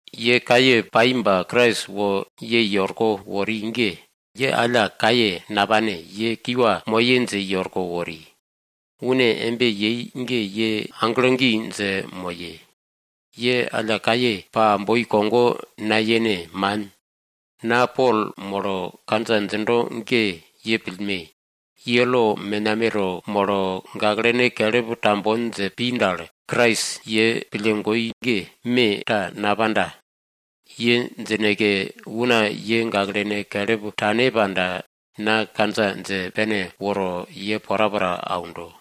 Ye kaye pai ba Krais wo ye i orko wori ge, ye alla kaye napane, ye kiwa moye dje i orko wori. Une embe yei ge ye aglo gi dje moye! Ye alla kaye pa boi kogo nayene! Man! Na Pol molo kandja djindo ge ye pillme! Ye lo menameto molo, gaklene kelip tambon dje pi dal, Krais ye pille goi ge me ta napanda. Ye djineke una ye gaklene kelip tane panda, na kandja dje pene woro ye porapora aundo.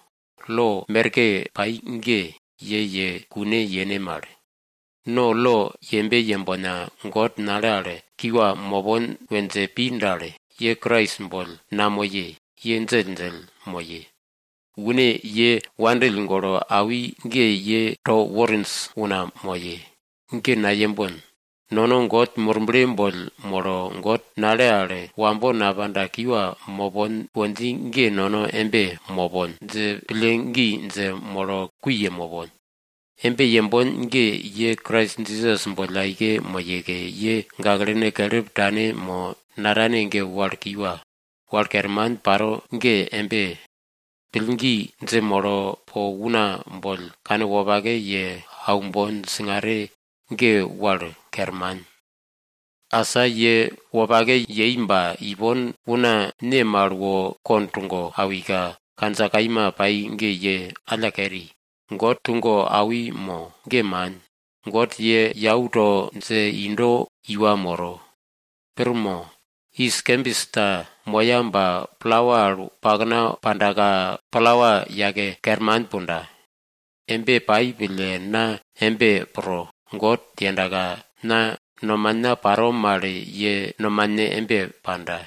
Lo merke pai ge ye ye kune yene mal. No lo yembe yembona, God nale al kiwa mopon we dje pi dal, ye Krais boll namoye, ye djelldjell moye. Une ye wopake pille awi ge ye to worinj una moye. Ge nayembon. Nono God Murble boll molo, God nale al wambo napanda kiwa mopon we dji ge nono embe mopon dje pillgi dje molo kui ye mopon. Embe yembon ge, ye Krais Jisas boll aike moyeke, ye gaklene kelip tane mo natane ge wal kiwa. Wal kerman paro ge embe, pillgi dje molo po una boll kanwopake ye aumbon. Singare ge wal kerman. Asa ye wopake yei ba, ipon una ne mal wo kond tugo awika kandja kaima pai ge ye alla keri? God tugo awi mo? Ge man, God ye yau to dje indo iwa moro. Pir mo? Yis kembis ta moya ba palawa al pakna pandaka, palawa yake kerman punda. Embe paro pille na embe pro. God yendaka na nomana paro mal ye nomane embe panda.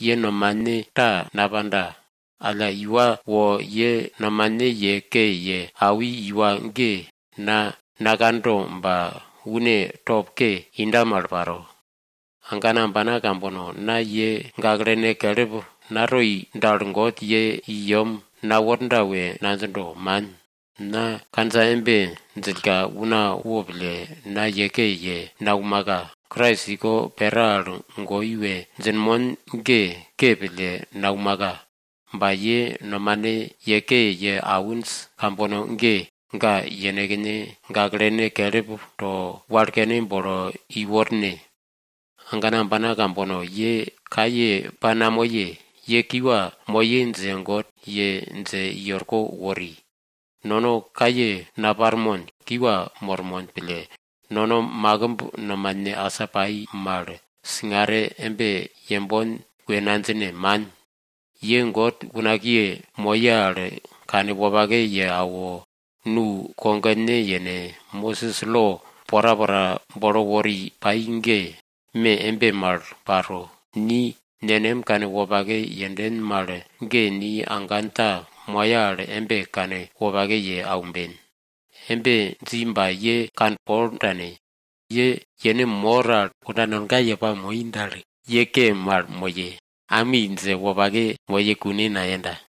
Ye nomane ta napanda. Alla una wo ye nomane ye ke ye awi una ge na nakando ba une top ke inda mal paro. Agana ambana kambono, na ye gaklene kelip natoi dal, God ye i yem naworda we nadjindo, man. Na kandja embe djillka, una wo pille, na ye ke ye naumaka. Krais iko pera al goi we djinmon ge ke pille naumaka. Ba ye nomane ye ke ye awinj kambono ge, ga yenekne gaklene kelip to, walkene bolo i worne. Agana ambana kambono, ye kaye pa namoye, ye kiwa moye dje God ye dje i orko wori. Nono kaye naparmon, kiwa mormon pille nono makimb nomane asa pai mal singare embe yembon we nadjine, man. Ye God unakiye moye al kanwopake ye awo, nu kogone yene! Mosis lo porapora bolo wori pai ge me embe mal paro. Ni nenem kanwopake yenden mal ge ni agan ta moya al embe kanwopake ye aumben. Embe dji ba ye kanpol tane. Ye yene mor al kunda nonga ye pamoi dal, ye ke mal moye, ami dje wopake moye kune nayenda.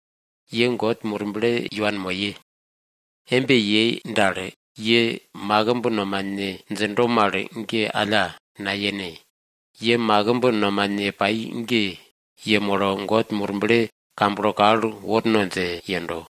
Ye God Murble i wanmoye. Embe yei dal, ye makimb nomane djindo mal ge alla nayene. Ye makimb nomane pai ge yemolo God Murble kamblo kal worno dje yendo.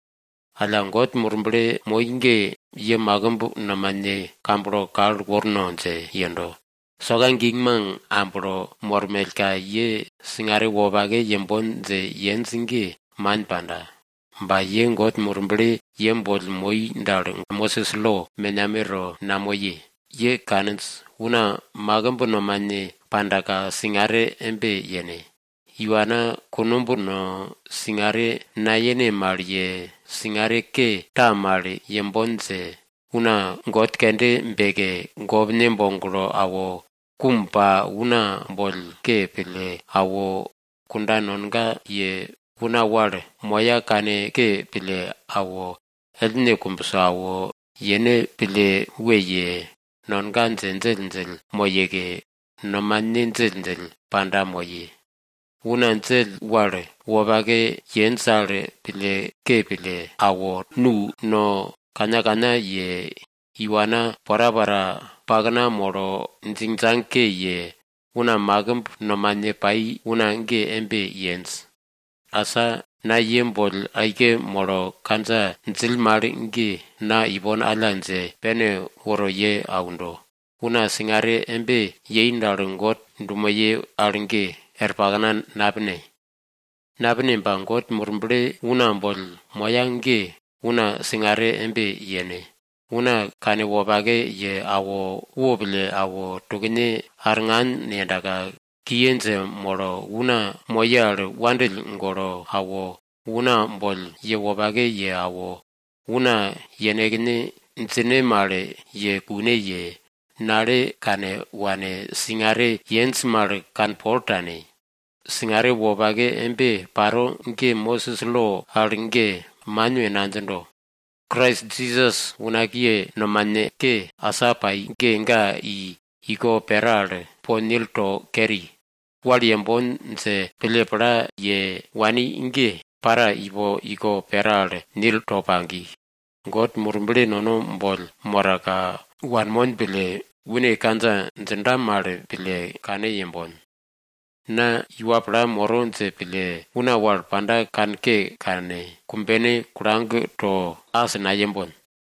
Alla, God Murble moi ge ye makimb nomane ge kamblo kal worno dje yendo. Soka gingmang amblo mormellka, ye singare wopake yembon dje yenj ge, man panda. Ba ye God Murble ye boll moi dal, Mosis lo menameto namoye. Ye kaninj, una makimb nomane pandaka singare embe yene. Iwana kunumb no, singare nayene mal ye, singare ke ta mal yembon dje, una god kende beke, gopne boglo awo, kum pa, una boll ke pille awo, kunda nonga ye, una wal moya kanke pille awo, ellne kumbso awo, yene pille we ye, nonga dje djelldjell moyeke, nomane djelldjell panda moye. Una djell wal wopake yenj al pille ke pille awo, nu no kannakanna ye, iwana porapora pakna molo djingdjang ke ye, una makimb nomane pai una ge embe yenj. Asa na ye boll aike molo kandja djill mal ge, na ipon alla dje pene woro ye aundo. Una singare embe yei dal, God dumoye wopake yero al ge, er pakna napine. Napine ba God Murble una boll moya ge, una singare embe yene. Una kanwopake ye awo, wopille awo, tukne arngan yendaka, kiye dje molo, una moye al wandill golo awo, una boll ye wopake ye awo, una yenekne djine mal ye kune ye, nale kane wane, singare yenj mal kanpol tane. Singare wopake embe paro ge Mosis lo al ge man we nadjindo. Krais Jisas unakiye nomane ke asa pai ge ga i iko pera al po nil to keri. Wal yembon dje pille pla ye wani wal ge, para ipo iko pera al nil to pagi. God Murble nono boll moraka wanmon pille, une kandja djinda mal pille kane yembon. Na iwa pla moro dje pille, una wal panda kanke kane, kumbene kulag to as nayembon.